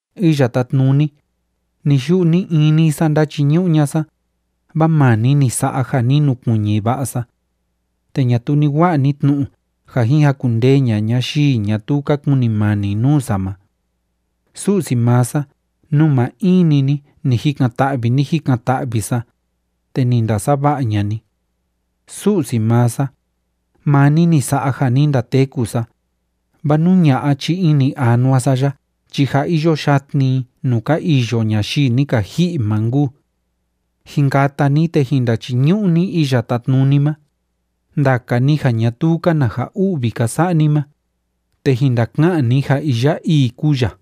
Iya Tátnuni, ni‑yu'u ni‑ini sa ndáchiñu'u ña'a sa, vaa maa ni ni sa'a ja ni nukuiñi va'a sa. Te ñatuu ni wa'a ni tnu'u ja jin jakundee ña'a ñayii ñatuu ka kunimani nuu sa ma. Su'si maa sa, nuu maa in‑ni ni ni jikan‑ta'vi, ni jikan‑ta'vi sa, te ni ndasava'a ña'a ni. Su'si maa sa, maa ni ni sa'a ja ni ndateku sa, vaa nú ña'a chi ini anua sa ya chi jâ iyo yatni i nuu ka iyo ñayii ni ka ji'i ma nkuu. Jin kata ni, te jin ndachiñu'u ni Iya Tátnuni ma, ndaka ni ja ñatuu‑ka na ja u'vi ka sa'a ni ma, te jin ndaka'an ni ja iya ii kúu ya.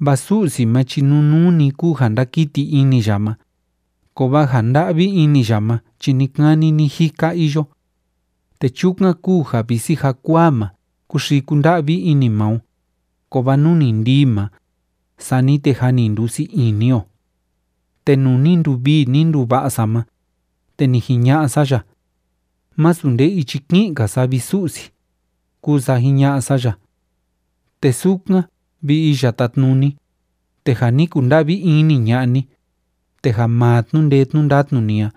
Vaa Su'si ma chi nunuu‑ni kúu ja ndakiti ini ya ma, kovaa ja nda'vi ini ya ma chi ni‑kani ni‑jika iyo. Te chukan kúu ja visi jakuaa ma kúxii kúnda'vi ini maa o, kovaa nú ni ndii ma, sani te jâ ni ndusii ini o. Te nuu ni nduvii, ni nduva'a sa ma, te ni jiña'a sa ya: “Másu nde ichi ki'in‑ka sa, vi Su'si”, kúu sa jiña'a sa ya. Te sukan, vi Iya Tátnuni, te ja ni kunda'vi ini ña'a ni, te ja maa tnu'u ndee tnu'u ndatnu ni a,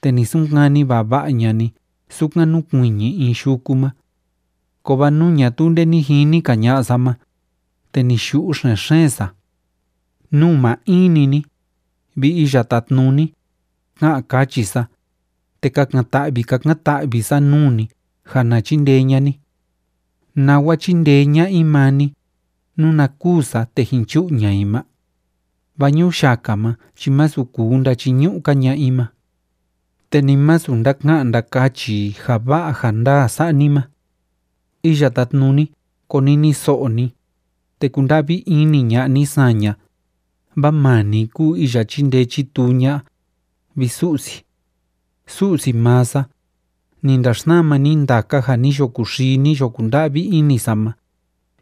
te ni sunkani vava'a ña'a ni sukan núkuiñi in yuku ma. Kovaa nuu ñatuu nde ni jini‑ka ña'a sa ma, te ni yu'u xen‑xeen sa. Nuu maa in‑ni ni, vi Iya Tátnuni, ka'an kachi sa, te kakan‑ta'vi kakan‑ta'vi sa nuu ni ja na chindee ña'a ni. ¿Nawa chíndee ña'a i maa ni, nuna kûu sa te jin chu'u ña'a i ma? Vaa ñuyaka ma chi másu kuu ndachiñu'u‑ka ña'a i ma. Te ni masu ndaka'an ndakachi i ja va'a ja ndaa sa'a ni ma. Iya Tátnuni, koniniso'o ni, te kunda'vi ini ña'a ni saña, vaa maa ni kúu iya chíndee chítuu ña'a, vi Su'si. Su'si maa sa, ni ndaxsama ni ndaka ja ni yo kuxii, ni yo kunda'vi ini sa ma,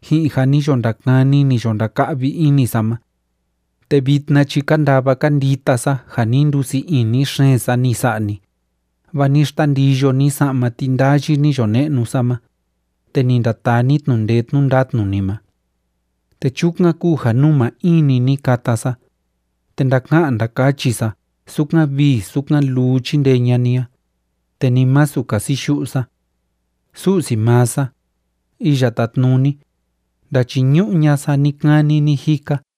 ji'in ja ni yo ndakani, ni yo ndaka'vi ini sa ma. Te vitna chi kandava kandita sa ja ni ndusii ini xeen sa, ni sa'a ni, vaa ni xtandiyo ni sa'ma tindayi ni yo ne'nu sa ma, te ni ndataa ni tnu'u ndee tnu'u ndatnu ni ma. Te chukan kúu ja nuu maa in‑ni ni kata sa, te ndaka'an ndakachi sa sukan vii sukan luu chíndee ña'a ni a, te ni masu kasiyu'u sa. Su'si maa sa, Iya Tátnuni, ndachiñu'u ña'a sa ni‑kani ni‑jika.